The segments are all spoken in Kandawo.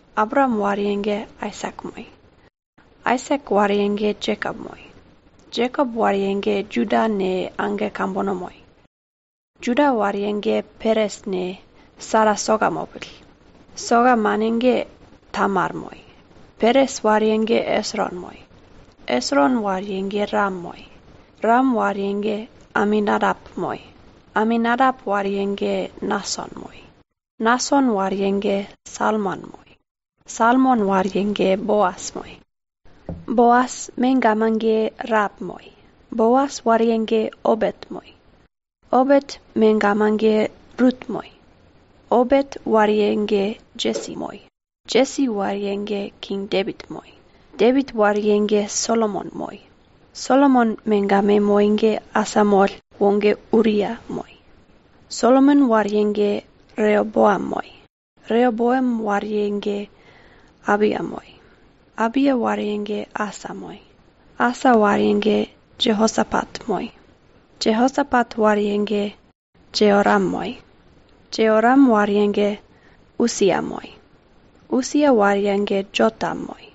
Abraam wariye ge Aisak moi. Aisak wariye ge Jekop moi. Jekop wariye ge Juda ne, age kambono moi. Juda wariye ge Peres ne, Sera soka mopill. Soka mane ge Tamar moi. Peres wariye ge Esron moi. Esron wariye ge Ram moi. Ram wariye ge Aminadap moi. Aminadap wariye ge Nason moi. Nason wariye ge Salmon moi. Salmon wariye ge Boas moi. Boas megama ge Raep moi. Boas wariye ge Obet moi. Obet megama ge Rut moi. Obet wariye ge Jesi moi. Jesi wariye ge King Depit moi. Depit wariye ge Solomon moi. Solomon megama moi ge asamoll woge Uria moi. Solomon wariye ge Reoboam moi. Reoboam wariye ge Abia moi. Abia wariye ge Asa moi. Asa wariye ge Jeosapat moi. Jeosapat wariye ge Jeoram moi. Jeoram wariye ge Usia moi. Usia wariye ge Jotam moi.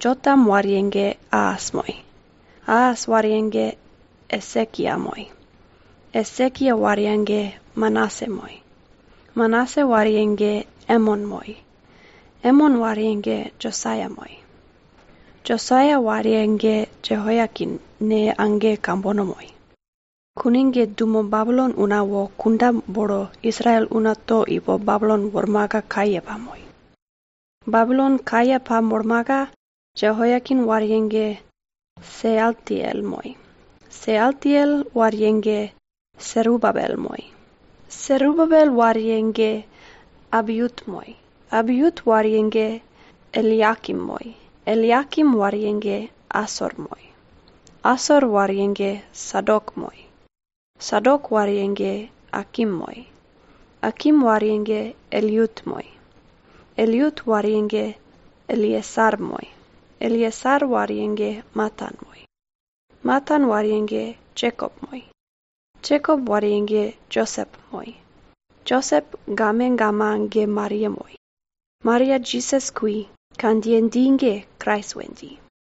Jotam wariye ge Aas moi. Aas wariye ge Esekia moi. Esekia wariye ge Manase moi. Manase wariye ge Emon moi. Emon wariye ge Josaia moi. Josaia wariye ge Jeoiakin ne, age kambono moi. Kune ge dumo Babilon una wo kunda bolo Israel una to ipo Babilon wormaka kaye pamoi. Babilon kaye pamolmaka Jeoiakin wariye ge Sealtiel moi. Sealtiel wariye ge Serubabel moi. Serubabel wariye ge Abiut moi. Abiut wariye ge Eliakim moi. Eliakim wariye ge Asor moi. Asor wariye ge Sadok moi. Sadok wariye ge Akim moi. Akim wariye ge Eliut moi. Eliut wariye ge Eleasar moi. Eleasar wariye ge Matan moi. Matan wariye ge Jekop moi. Jekop wariye ge Josep moi. Josep gamegama ge Maria moi. Maria Jisas kui, kandjiye dji ge Krais we dji.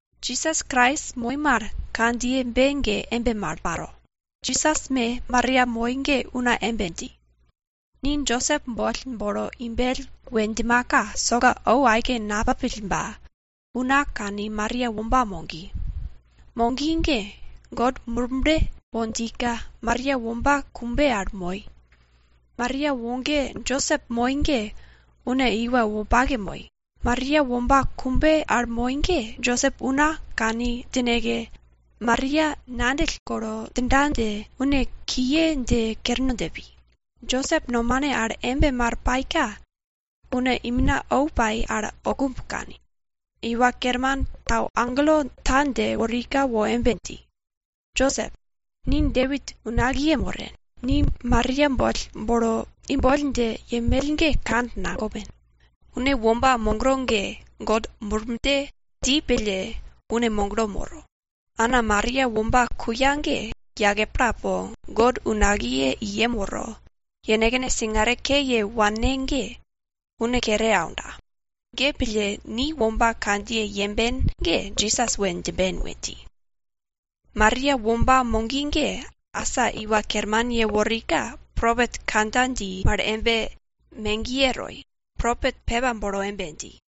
Jisas Krais moi mal kandjiyebe ge embe mal paro. Jisas me Maria moi ge una embe dji, ni Josep boll bolo imbell we djimaka, soka ou aike napapill ba, una kani Maria womba mogi. Mogi ge God Murble wo djika Maria womba kumbe al moi. Maria woge Josep moi ge une iwa wopake moi. Maria womba kumbe al moi ge Josep una kane djineke, Maria ngandjill golo djinda dje, une kiye dje kerno dje pi. Josep nomane al embe mal paika une imina ou pai al oukumb kani. Iwa Kerman tau agelo ta dje worika wo embe dji, Josep, ni Depit unakiye moren, ni Maria boll bolo imboll dje yenmell ge kand nagopen. Une womba mogro ge God Murble dji pille une moglo moro. Ana Maria womba kuya ge, yake pla po, God unakiye i yem woro, yenekne singare ke ye wanne ge une kere aunda. Ge pille, ni womba kandjiye yemben ge Jisas we djimben we dji. Maria womba mogi ge, asa Iwa Kerman yeworika, propet kandja dji mal ge megiye toi. Propet pepa bolo embe dji,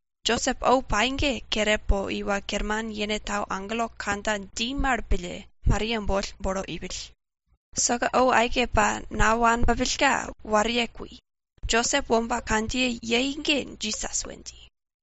Josep ou pai ge kere po Iwa Kerman yene tau agelo kandja dji mal pille, Maria boll bolo ipill. Soka ou aike pa nawane pupillka, wariye kui. Josep womba kandjiye yei ge Jisas we dji.